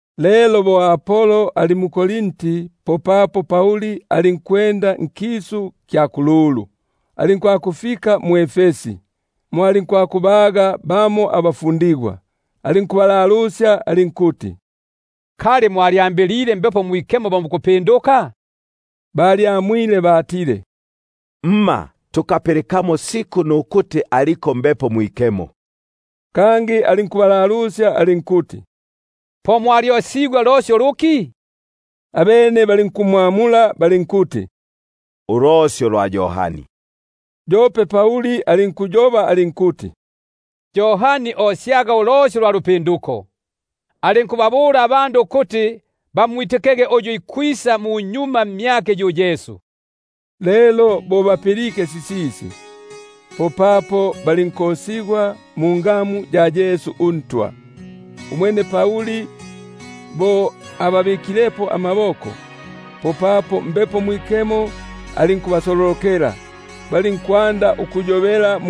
Lelo bo Apolo ali mu-Korinti, popapo Pauli alinkukisania nkisu kya kululu, alinkufika mwʼEfesi; mo alinkubaga bamo abafundigwa, alinkubalalusya alinkuti: Kali mwalyambilile Mbepo Mwikemo pala mwitikege? Abene balinkuti: Himma, kope nukupilika tukapilikamo ukuti aliko Mbepo Mwikemo. Kangi alinkubalalusya alinkuti: Po mwalyokesigwe mfiki lelo? Abene balinkumwamula bali- nkuti: Ndosyo lwa Yohani. Umwene Pauli alinkuti: Yohani yo osyaga ulosyo lwa lupinduko, alinkubabula abandu ukuti bamwitikege uyu ikwisa munyuma mmyake, yu Yesu. Lelo bo bapilike sisisi, popapo balinkokesigwa mungamu ya Ntwa Yesu. Umwene Pauli bo ababikilepo amaboko, popapo Mbepo Mwikemo alinkubasololokela, balinkwanda ukuyobela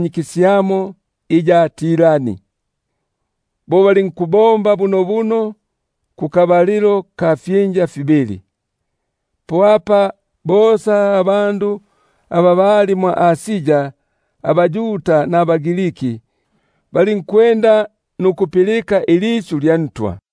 kisyamo iya Tirani. Bo silinkubombigwa bunobuno ifyinja fibili. Po apa bosa aba bali mwʼAsia abaYuda nabaGrild balinkulipilika ilisyu lya Ntwa.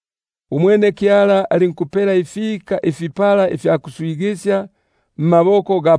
Umwene Kyala alinkupelela ifika ifipata mmaboko ga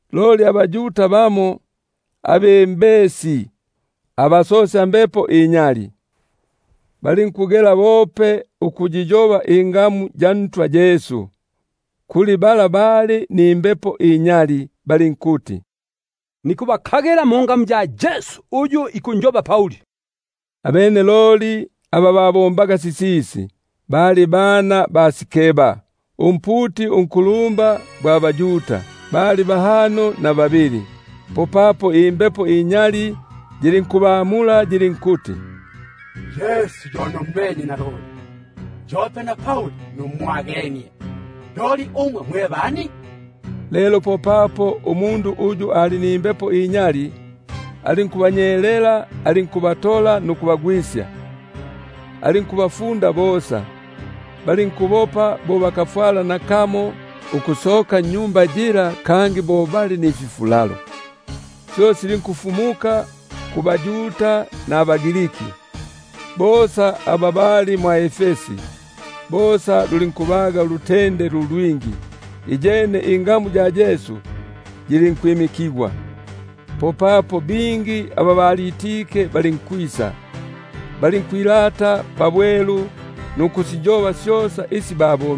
Loli bamo abaYuda abembesi abasosyambepo inyali, balinkugela ukuyiyoba ingamu ya Ntwa Yesu kuli aba bali nimbepo inyali, balinkuti: Nikubayigila mwa Yesu uyu Pauli ikumfu- musya. Abene aba babombaga sisisi, bali bana ba Sikeba, umputi unkulumba gwa baYuda, bali bahano na babili! Popapo imbepo inyali yilinkubamula yilinkubabula yilinkuti: Yesu yo nummenye naloli, yope na Pauli numwagenie; loli umwe mwe bani? Lelo popapo umundu uyu ali nimbepo inyali alinkubanyelela, alinkubatola nukubafunda bosa, balinkubopa kisitakufwala nakamo ukusoka nnyumba yila bo bafulele. Syo silinkufumuka kubaYuda nabaGriki bosa aba bali mwʼEfesi; bosa lulinkubaga ulutende lu lwingi; iyene ingamu ya Ntwa Yesu yilinkwimikigwa. Popapo bingi aba balitike balinkwisa, balinkwilata nukusiyoba syosa isi babo-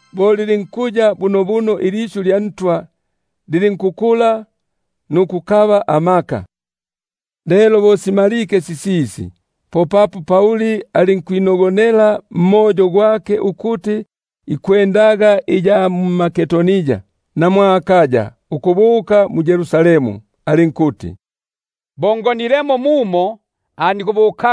Bo lilinkuya bunobuno ilisyu lya Ntwa, lilinkukula nukukaba amaka. Lelo bo simalike sisisi, popapo Pauli alinkwinogonela mwa Mbepo ukuti ikwendaga iya mMakedonia na mwʼAkaya ukubuka mu-Yerusalemu; alinkuti: Bo ngonilemo mumo, po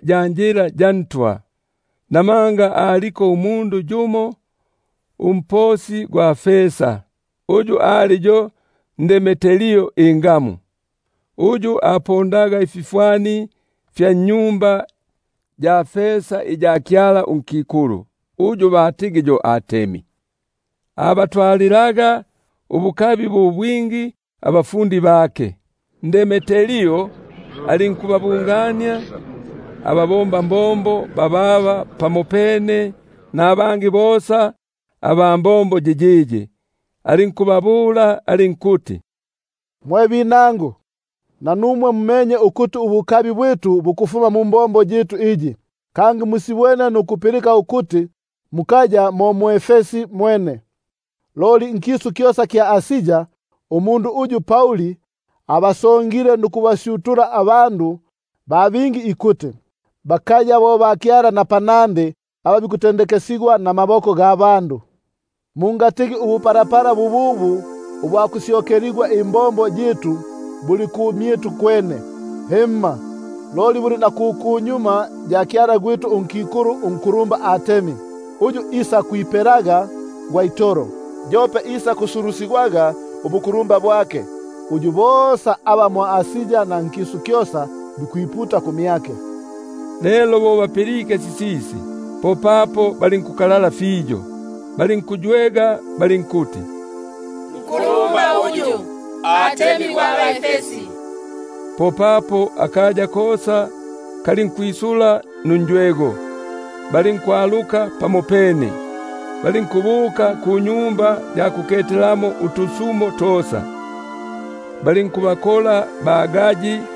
ya njila yiyiyi; namanga umundu yumo umposi gwa fesa, uyu ali yo Demetrio ingamu, uyu apondaga utwa batempeli twa fesa twa Artemi, abatwalilaga ubukabi bu bwingi abafundi bake, alinkubabungania bababa pamopene nabangi bosa aba mbombo yiyiyi, alinkubabula alinkuti: Mwe binangu, nanumwe mumenye ukuti ubukabi bwitu bukufuma mumbombo yitu iyi, kangi musibwene nukupilika ukuti, mukaya mo mwʼEfesi mwene, loli nkisu kyosa kya Asia, umundu uyu Pauli abasongile nukubasyutula abandu ba bingi ikuti: Bakaya bo bakyala aba bikutendekesigwa namaboko. Mungatigi ubupalapala bububu ubwa kusyokeligwa imbombo yitu buli ku kumyitu kwene, himma, loli buliko na ku kwa tempeli gwa kyala gwitu unkikulu unkulumba Artemi, uyu isakwipela gwa itolo, yope isakwisigwa ubukulumba bwake, uyu bosa aba mwʼAsia na nkisu kyosa bikwiputa kumyake. Lelo bo bapilike sisisi, popapo balinkukalala fiyo, balinkuywega balinkuti: Nkulumba yu Artemi gwa bʼEfesi! Popapo akaya kosa kalinkwisula nunjwego, balinkwaluka pamopene, balinkubuka kunyumba ya tusumo, balinkubakola ba-Gayi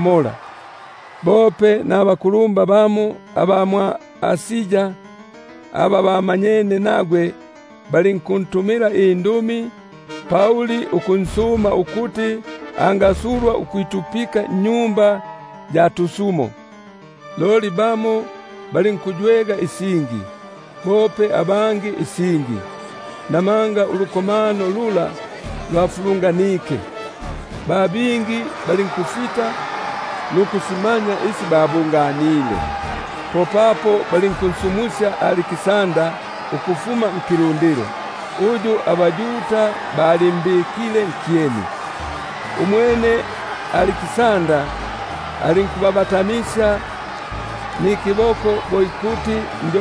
nukumwitikisya. Bope nabakulumba bamo aba mwʼAsia aba bamanyene nagwe, balinkuntumila indumi nukunsuma ukuti, angasulwa ukwitupika nnyumba ya tusumo. Loli bamo balinkuywega isingi, bope abangi isingi; namanga ulukomano lula lwafulunganike, ba bingi balinkusita nuku- simanya isi babunganile. Popapo balinkunsumusya Aliksandara ukufuma nkilundilo, uyu abaYuda balimbikile nkyeni. Umwene Aliksandara alinkubabatamisya nikiboko bo ikuti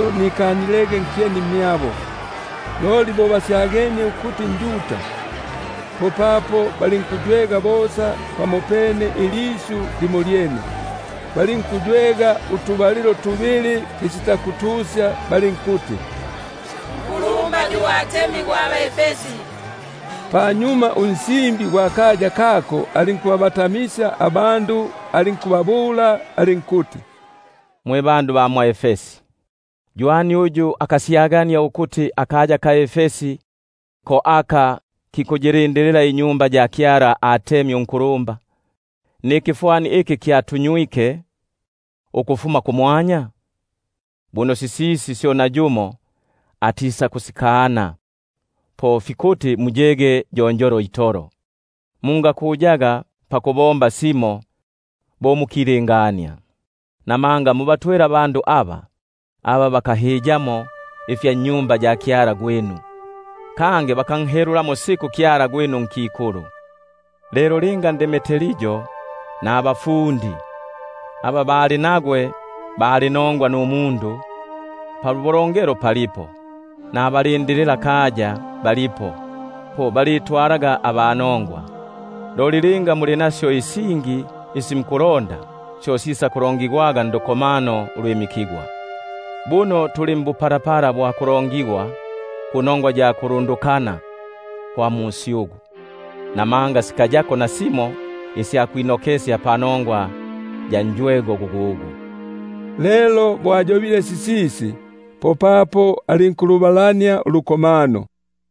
nikanilege nkyeni mbandu bala. Loli bo basyagenie ukuti nJuda, popapo balinkuywega bosa pamopene ilisyu limolyene, balinkukolela utubalilo tubili balinkuti: Nkulumba yu Artemi gwa bʼEfesi. Popapo unsimbi gwa kaya kako alinkukibatamisya ikilundilo, alinkuti: Mwe bandu ba mwʼEfesi, ywani uyu akasyagania ukuti akaya ka Efesi ko aka kikundindilila tempeli gwa Artemi unkulumba, nikifwani iki kyatunywike ukufuma kumwanya? Buno sisisi syo nayumo atikusikana, po fikuti muyege yonjolo itolo, mungakuyaga ukubomba simo. Namanga mubatwele abandu aba, aba bakahiyamo ifya mwa tempeli, kangi bakanhelulamo siku kyala gwitu unkikulu. Lelo linga Demetrio nabafundi aba bali nagwe bali nongwa numundu, pabulongelo palipo, nabalindililakaya balipo, po balitwalanaga aba nongwa. Loli linga muli nasyo isingi isi mukulonda, syo sisakulongigwaga ndukomano ulwimikigwa. Buno tuli mbupalapala bwa kulongigwa kunongwa ya kulundukana kwa musyugu; namanga sikayako nasimo isya kwinokesya panongwa ya njwego gugugu. Lelo bo ayobile sisisi, popapo alinkulubalania ulukomano.